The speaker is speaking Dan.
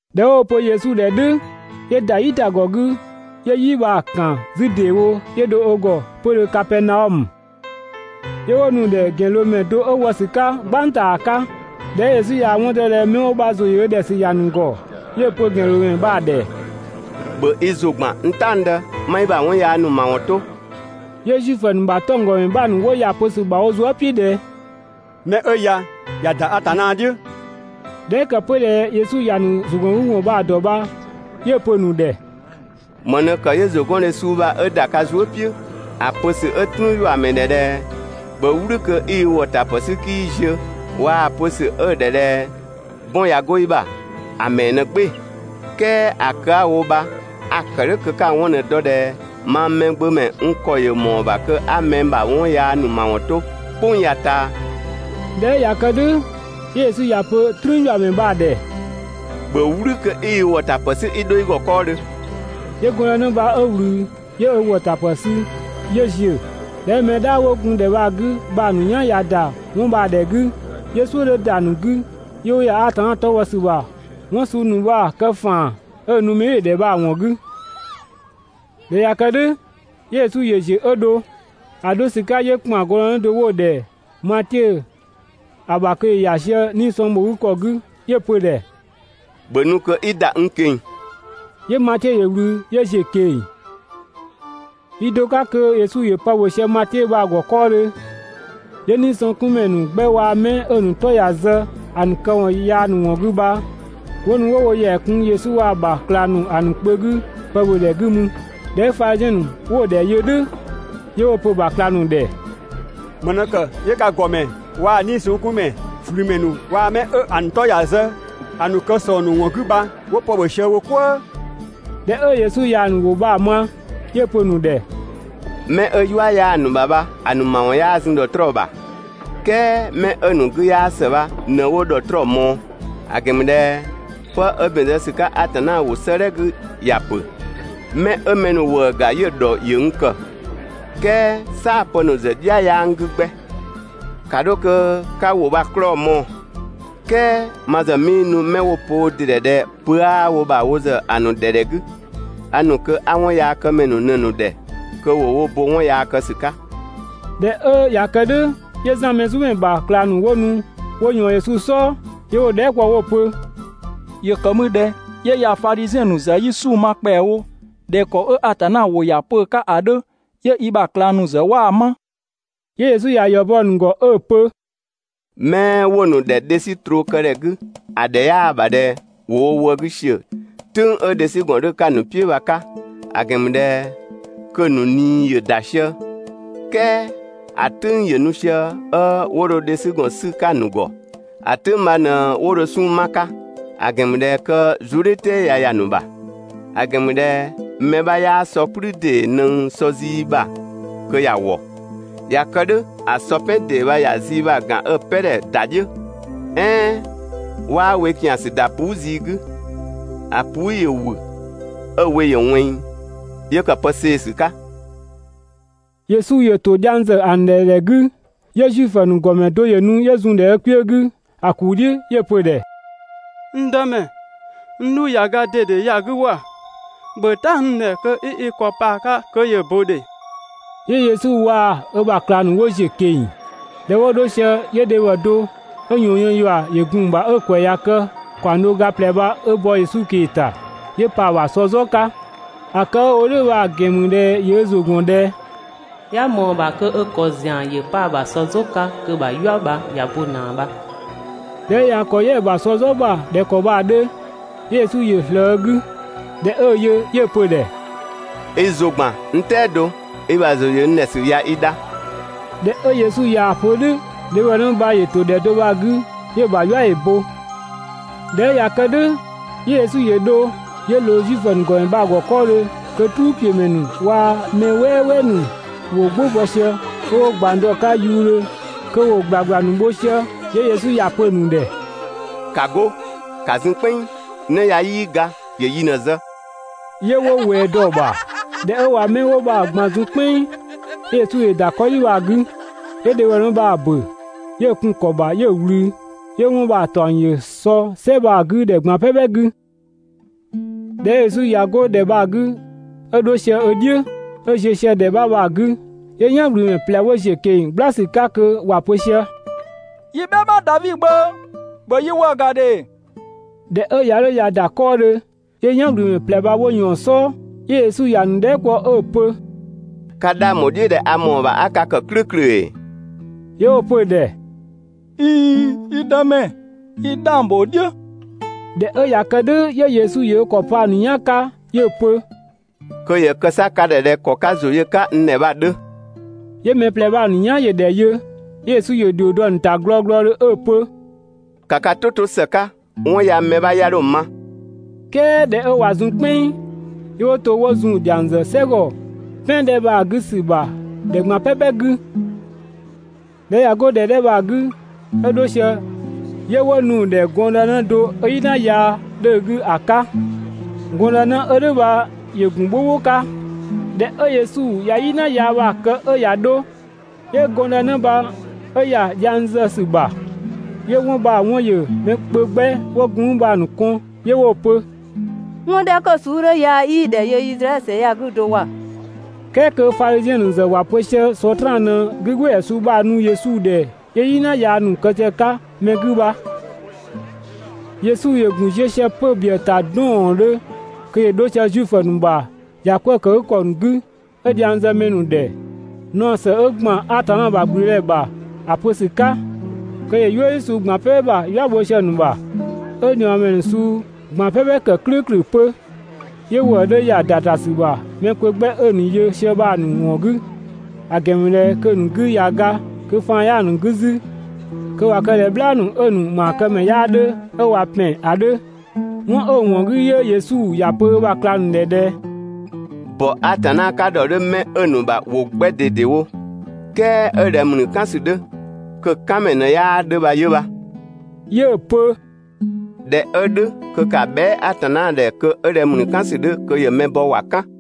꞊Dhɛ 'wo‑ pö Yesu ‑dhɛ "dhʋ̈, 'yö ‑da "yitagɔ 'gü 'yö "yi bha‑ ‑kan 'zü ‑deewo 'yö dho ö ‑gɔ 'pödhö Kapɛɛnaɔmö. 'Yö 'wo nu‑ ‑dhɛ ‑gɛnloomɛ do 'ö wɔ ‑sü 'ka "gbang ‑ta ‑a 'ka. ꞊Dhɛ 'ö Yesu ꞊yaa‑ 'wɔn dɔ ꞊dhɛ mɛ 'wo bha ‑zʋ ‑yö ö ‑dhɛ ‑sü ‑ya ‑nu ‑gɔ, 'yö‑ pö ‑gɛnloomɛ bha‑ ‑dhɛ: «‑Bhö i ‑zʋ ‑gban, n "taɔngdë, 'ma i ‑bha 'wɔn yaa ‑nu ‑mawɔn 'to!» 'Yö Zuifö ‑nu ‑bha 'tɔnggɔmɛ 'bha ‑nu 'wo ‑ya ‑a pö ‑sü ‑bha wo zuë" "piʋ̈ ꞊dhɛ: «'Mɛ 'ö ya ꞊ya ‑da Atanna "dhiʋ̈!» ꞊Dhɛ 'ö ‑kë 'pö ꞊dhɛ Yesu ‑ya ‑nu ‑zʋgɔngüwɔn ‑nu bha‑ ‑dɔ bha 'yö‑ pö‑ ‑nu ‑dhɛ: «‑Më ꞊në ‑kë 'yö ‑zʋgɔndhe suu bha 'ö ‑da ka zuë" "piʋ̈? ‑A pö ‑sü 'ö "trüünyuamɛ ‑dhɛ ꞊dhɛ ‹‑bhö "wlü kö 'i i ‑wɔtapë 'sü 'kii ziö› waa‑ pö ‑sü 'ö‑ ‑dhɛ ꞊dhɛ ‹'bɔn ꞊ya 'go i ‑bha» ‑a ‑mɛɛ ꞊në "gbɩɩ‑?› "Kɛɛ ‑a kë 'a‑ wo bha a‑ ‑kë "dhʋ̈ kö 'ka‑ 'wɔn ꞊në‑ dɔ ꞊dhɛ mang Mɛgbömɛ n ‑kɔ ‑yö ‑mɔɔ ‑bha kö 'a mɛ ‑bha 'wɔn yaa ‑nu ‑mawɔn 'to "kpʋng ya‑ ꞊taa.» ꞊Dhɛ 'ö ꞊ya kë "dhʋ̈, 'yö Yesu ‑ya pö "trüünyuamɛ bha‑ ‑dhɛ: «‑Bhö "wlü kö 'i i ‑wɔtapë 'sü 'i 'dho i ‑gɔ 'kɔɔdhö!» 'Yö gɔndënë bha 'ö ꞊wlü, 'yö ö ‑wɔtapë sü 'yö ‑ziö. ꞊Dhɛ 'ö mɛ "dhaa 'wo gun ‑dhɛ bha‑ 'gü bha‑ ‑nu "yan ꞊ya ‑da 'wɔn bha‑ ‑dhɛ 'gü, 'yö "suʋ̈ 'dhö ‑da ‑nu 'gü 'yö 'wo ‑ya Atanna 'tɔ bhɔ ‑sü ‑bha 'wɔn suu ‑nu bha‑ kë ‑faan 'ö‑ nu mɛbhɩɩdhe ‑dhɛ bha‑ ‑wɔn 'gü. ꞊Dhɛ 'ö ꞊ya kë "dhʋ̈, 'yö Yesu ‑yö ziö 'ö dho. ‑A 'dho ‑sü 'ka 'yö ‑kpan gɔndë do 'wo‑ ‑dhɛ Matiö ‑a ‑bha kö ‑yö ‑ya sië 'nii‑ sɔng ‑bho 'gü ‑kɔ 'gü 'yö‑ pö‑ ‑dhɛ: «‑Bhö nu kö 'i ‑da n ꞊keng‑!» 'Yö Matiö ‑yö ꞊wlü 'yö ‑ziö ꞊keng‑. Yi do 'ka kö Yesu ‑yö pë ‑bhö sië Matiö bha‑ ‑gɔ 'kɔɔdhö, 'yö 'niisɔngkunmɛ ‑nu 'gbɛ waa‑ 'mɛ 'ö‑ ‑nu 'tɔ ꞊ya zë ‑a ‑nu këwɔn yaa ‑nu ‑wɔn 'gü bha, 'wo nu 'wo wo ‑yɛa kun Yesu waa‑ ‑bha ꞊klang ‑nu ‑a ‑nu kpö 'gü pë ‑bhö ‑dhɛ 'gü mü. ꞊Dhɛ 'ö Fadhiziɛn ‑nu 'wo‑ ‑dhɛ yö "dhʋ̈ 'yö 'wo‑ pö‑ ‑bha ꞊klang ‑nu ‑dhɛ: «‑Më ꞊në ‑kë 'yö ka ‑gɔmɛ waa‑ 'niisɔngkunmɛ, ꞊flümɛ ‑nu bha waa‑ 'mɛ 'ö‑ ‑nu 'tɔ ꞊ya zë ‑a ‑nu kë ‑sɔng ‑nu ‑wɔn 'gü bha 'wo pë ‑bhö sië wo "kwëë?» ꞊Dhɛ 'ö Yesu ꞊yaa‑ ‑nu ‑wʋ bha‑ ma, 'yö‑ pö‑ ‑nu ‑dhɛ: «'Mɛ 'ö "yua 'yaa‑ ‑nu ‑bha bha, ‑a ‑nu ‑mawɔn 'yaa zun ‑dhɔtrɔɔ ‑bha, "kɛɛ 'mɛ 'ö‑ ‑nu 'gü 'yaa ‑së bha ꞊në 'wo ‑dhɔtrɔɔ ꞊mɔɔ; ‑a ‑gɛn ‑mü ꞊dhɛ 'pë 'ö ‑bɛn zë ‑sü 'ka Atanna ‑wʋ 'sëëdhɛ 'gü ‑ya ‑pö: ‹'Mɛ 'ö mɛ ‑nu ‑wëë ‑ga 'yö‑ ‑dhɔ ‑yö n ‑kë, "kɛɛ "saapë ‑nu ‑zë "dhia 'yaa n 'gü 'gbɛ.› ‑Ka 'dho kö 'ka ‑wʋ bha‑ 'klɔɔ‑ mɔɔ‑! "Kɛɛ ma ‑zë 'mii nu 'mɛ 'wo‑ pö wo ‑dɩ ‑dhɛ ꞊dhɛ pö 'aa wo ‑bha wo ‑zë ‑a ‑nu ‑dhɛ ‑dhɛ 'gü, a ‑nu kö 'a 'wɔnyaakëmɛ ‑nu ꞊në‑ ‑nu ‑dhɛ kö ‑wo wo bo 'wɔn yaa kë ‑sü 'ka. ꞊Dhɛ 'ö ꞊ya kë "dhʋ̈, 'yö Zan Mɛzumɛ ‑bha ꞊klang ‑nu 'wo nu 'wo ꞊yɔɔn Yesu "sɔɔ, 'yö 'wo‑ dhɛɛ" kpɔ 'wo‑ pö: «‑Yö ‑kë mü ꞊dhɛ 'yö yaa‑ Fadhiziɛn ‑nu ‑zë 'yi 'sunng‑ ma ‑kpɛawo (꞊dhɛ ‑kɔ 'ö Atanna ‑wʋ ‑ya pö‑ 'ka ‑a 'dhö), 'yö i ‑bha ꞊klang ‑nu ‑zë 'waa‑ 'ma?» 'Yö Yesu ‑ya ‑yɔ bɔ‑ ‑nu ‑gɔ 'ö‑ pö: «'Mɛ 'wo‑ ‑nu ‑dhɛ dhe 'sü troo kë ‑dhɛ 'gü ‑a ‑dhɛ 'yaa‑ ‑bha ꞊dhɛ ‑wo wo wë 'gü ‑siö "tʋ̈ng 'ö dhesügɔn 'dhö‑ 'ka‑ ‑nu "piʋ̈ bha‑ 'ka (‑a ‑gɛn ‑mü ꞊dhɛ kö‑ ‑nu ꞊nii ‑yö ‑da sië), "kɛɛ ‑a "tʋ̈ng ‑yö nu sië 'ö 'wo dho dhesügɔn 'sü‑ 'ka‑ ‑nu ‑gɔ; ‑a "tʋ̈ng bha ꞊në 'wo dho 'sunng‑ 'ma‑ 'ka (‑a ‑gɛn ‑mü ꞊dhɛ kö zuëdhiʋ̈tɛɛ ꞊ya ‑ya ‑nu ‑bha). ‑A ‑gɛn ‑mü ꞊dhɛ mɛ 'bha 'yaa sɔ "kplü ‑dee ꞊nëng sɔ zii ‑bha kö ‑ya ‑wɔ. ꞊Ya kë "dhʋ̈ ‑a sɔ "pɛn ‑dee bha ‑ya zii bha‑ ‑gan 'ö‑ "pɛ ‑dhɛ ‑da "dhiʋ̈. "Ɛɛn 'waa we ‑kiansü ‑da puu" zii 'gü, ‑a puu" ‑yö ‑wü 'ö‑ we ‑yö ꞊wɛnng 'yö ‑kë pë see‑ ‑sü 'ka. Yesu ‑yö ‑to dhiang ‑zë ‑a ‑nu ‑dhɛ ‑dhɛ 'gü, 'yö Zuifö ‑nu ‑gɔmɛ do ‑yö nu 'yö zun ö kpiö 'gü ‑a ‑kuu "dhiʋ̈ 'yö‑ pö‑ ‑dhɛ: «N Dëmɛ, n 'dhu ꞊ya ga ‑dede ya‑ 'gü ‑wa! ‑Bhö "ta n ‑dhɛ kö 'i i ‑kɔ 'pa‑ 'ka kö ‑yö ‑bö ‑dhe!» 'Yö Yesu waa‑ ö ‑bha ꞊klang ‑nu 'wo ‑ziö ꞊keng‑. ꞊Dhɛ 'wo 'dho sië 'yö dhebhɔ do 'ö ꞊yɔɔn yën ‑yua ‑yö zun‑ ‑bha 'ö‑ ‑kwɛ ꞊ya kë ‑kaɔng do ga ꞊plɛ bha 'ö bɔ Yesu ꞊kee‑ ‑ta 'yö ö ‑kɔ pa‑ ‑bha ‑sɔ "zɔ 'ka. ‑A kë 'ö‑ wo "dhʋ̈ bha‑ ‑gɛn ‑mü ꞊dhɛ ‑yö ö ‑zʋ ‑gɔn ꞊dhɛ: «'Ya ꞊mɔɔ‑ ‑bha kö ö ‑kɔ ‑zian ‑yö 'pa‑ ‑bha sɔ "zɔ 'ka kö‑ ‑bha "yua ya ꞊ya bo ꞊naa bha.» ꞊Dhɛ 'ö ꞊ya ö ‑kɔ "yɛ‑ ‑bha sɔ "zɔ ‑bha ꞊dhɛ ‑kɔ bha‑ 'dhö, 'yö Yesu ‑yö ꞊slëë ö 'gü. ꞊Dhɛ 'ö‑ yö, 'yö‑ pö‑ ‑dhɛ: «i ‑zʋ ‑gban, n "tɛado, i ‑bha ‑zʋ ‑yö n ‑dhɛ ‑sü ꞊ya i dha!» ꞊Dhɛ 'ö Yesu ꞊yaa‑ pö "dhʋ̈, dhebhɔnë bha ‑yö ‑to ‑dhɛ do bha‑ 'gü 'yö‑ ‑bha "yua ‑yö bo. ꞊Dhɛ 'ö ꞊ya kë "dhʋ̈, 'yö Yesu ‑yö dho 'yö ꞊loo Zuifö ‑nu ‑gɔmɛ bha‑ ‑gɔ 'kɔɔdhö kö "truupiömɛ ‑nu waa‑ mɛ "wɛɛwɛɛ ‑nu ‑wo "gbʋ bɔ sië, 'ö 'wo ꞊gbang dɔ‑ 'ka yuudhö kö ‑wo ‑gblagbla ‑nu bho sië. 'Yö Yesu ‑ya pö‑ ‑nu ‑dhɛ: «‑Ka 'go, ‑ka zun "kpɛnng! 'Në ya 'yii ga, ‑yö yi ꞊në‑ zë!» 'Yö 'wo ꞊wɛɛ dɔ‑ ‑bha. ꞊Dhɛ 'ö ꞊wa 'mɛ 'wo bha‑ ꞊gban zun "kpɛnng, 'yö Yesu ‑yö ‑da 'kɔdhi bha‑ 'gü, 'yö 'nëdhebhɔ bha‑ ‑bö, 'yö‑ kun‑ ‑kɔ ‑bha 'yö‑ ꞊wlü. 'Yö 'wɔn bha‑ ‑taɔng ‑yö sɔ "sɛ bha‑ 'gü ‑dhɛ ꞊gban "pɛpɛ 'gü. ꞊Dhɛ 'ö Yesu ꞊ya 'go ‑dhɛ bha‑ 'gü 'ö dho sië ö "dhiʋ̈, 'ö ziö sië ‑dhɛ 'bha bha‑ 'gü, 'yö "yan ꞊wlümɛ ꞊plɛ 'wo ‑ziö ꞊keng‑ "gbla ‑sü 'ka kö ‑wa pö sië: «(Yi "bhɛma) Davi Gbö, ‑bhö yi ‑wëë ‑ga ‑dhe!» ꞊Dhɛ 'ö ꞊ya 'dho ꞊ya ‑da 'kɔɔdhö, 'yö "yanwlümɛ ꞊plɛ bha 'wo ꞊yɔɔn‑ "sɔɔ, 'yö Yesu ‑ya ‑nu dhɛɛ" kpɔ 'ö‑ pö: «Ka 'dhang ‑bho "dhiʋ̈ ꞊dhɛ a ‑mɔɔ ‑bha 'a ka ‑kë "klʋ̈ʋ̈klʋ̈ ‑ee?» 'Yö 'wo‑ pö‑ ‑dhɛ: «꞊Iin! Yi Dëmɛ, 'yi 'dhang ‑bho "dhiʋ̈.» ꞊Dhɛ 'ö ꞊ya kë "dhʋ̈ 'yö Yesu ‑yö ö ‑kɔ pa‑ ‑nu "yan 'ka 'yö‑ pö: «Kö ‑yö kë 'sa ka ‑dhɛ ꞊dhɛ ‑kɔ 'ka ka ‑zʋ yö‑ 'ka n ‑dhɛ bha‑ 'dhö!» 'Yö mɛ ꞊plɛ bha‑ ‑nu "yan ‑yö ‑dhɛ yö. 'Yö Yesu ‑yö ‑dhio dɔ‑ ‑nu ‑ta glɔglɔdhö 'ö‑ pö: «‑Ka ka "tʋ 'to ‑së 'ka, 'wɔn ya mɛ 'bha 'ya dho‑ ma!» "Kɛɛ ꞊dhɛ 'ö ꞊wa zun "kpɛnng, 'yö 'wo to 'wo zun‑ ‑dhiang ‑zë "sɛgɔ "pɛan 'dhɛ bha‑ 'gü ‑sü ‑bha ‑dhɛ ꞊gban "pɛpɛ 'gü. ꞊Dhɛ 'ö ꞊ya 'go ‑dhɛ 'dhɛ bha‑ 'gü 'ö 'dho sië, 'yö 'wo nu‑ ‑dhɛ gɔndënë do 'ö "yina yaa 'dhö‑ 'gü ‑a 'ka. Gɔndënë 'ö "dhʋ̈ bha ‑yö ‑gun "bhʋbhʋ 'ka. ꞊Dhɛ 'ö Yesu ꞊ya "yina yaa bha‑ kë 'ö ꞊ya 'dho, 'yö gɔndënë bha 'ö ‑ya dhiang zë ‑sü ‑bha. 'Yö 'wɔn bha‑ 'wɔn ‑yö mɛ kpö 'gbɛ 'wo gun mü bha‑ ‑nu kɔn 'yö 'wo‑ pö: «'Wɔn 'dhɛ 'kö‑ suu 'dhö ya 'yii‑ ‑dhɛ yö Izraɛdhö ‑sɛ ya‑ 'gü do ‑wa!» "Kɛɛ kö Fadhiziɛn ‑nu ‑zë ‑wa pö sië Sɔtraan ꞊në 'gügbɩɩdhɛ suu bha‑ ‑nu Yesu ‑dhɛ 'yö "yina yaa ‑nu kë sië‑ 'ka mɛ 'gü bha.» Yesu ‑yö ‑gun ziö sië 'pö‑ ‑nu ‑bhiëë ‑ta 'dɔɔɔndhö kö ‑yö 'dho sië Zuifö ‑nu ‑bha ‑yakwëëkëgükɔ ‑nu 'gü 'ö dhiang zë mɛ ‑nu ‑dhɛ, naɔ ‑së 'ö ‑gban Atanna ‑bha ‑gblüdëdhɛ ‑bha ‑a pö ‑sü 'ka kö ‑yö "yuëdhi suu ꞊gban "pɛpɛ ‑bha "yua ‑nu bho sië‑ ‑nu ‑bha, 'ö ꞊niɔɔmɛ ‑nu suu ꞊gban "pɛpɛ ‑kë "klʋ̈ʋ̈klʋ̈ 'pö. 'Yö ‑wëë 'dhö ‑ya ‑da ‑ta ‑sü ‑bha mɛ kpö 'gbɛ 'ö‑ ‑nu yö sië bha‑ ‑nu ‑wɔn 'gü, ‑a ‑gɛn ‑mü ꞊dhɛ kö‑ ‑nu 'gü ꞊ya ga, kö faan 'yaa‑ ‑nu 'gü 'zü, kö ꞊wa kë ꞊dhɛ "bhlaa ‑nu 'ö‑ ‑nu ‑maakëmɛ 'yaa 'dhö 'ö ꞊wa ‑pɛn ‑a 'dhö. 'Wɔn 'ö‑ ‑wɔn 'gü 'yö Yesu ‑ya pö ö ‑bha ꞊klang ‑nu ‑dhɛ ꞊dhɛ: «‑Bɔ Atanna 'ka ‑dhɔ 'dhö 'mɛ 'ö‑ ‑nu ‑bha ‑wo 'gbɛ ꞊dedewo, "kɛɛ 'ö ꞊dhɛ ‑mlü "kan ‑sü 'dhö, kö‑ "kanmɛ ꞊në 'yaa 'dhö bha 'yö bha. 'Yö‑ pö ꞊dhɛ 'ö "dhʋ̈ kö ‑ka bhɛa" Atanna ‑dhɛ kö 'ö ꞊dhɛ ‑mlü "kan ‑sü 'dhö kö ‑yö mɛ bɔ kö ‑wa "kan!»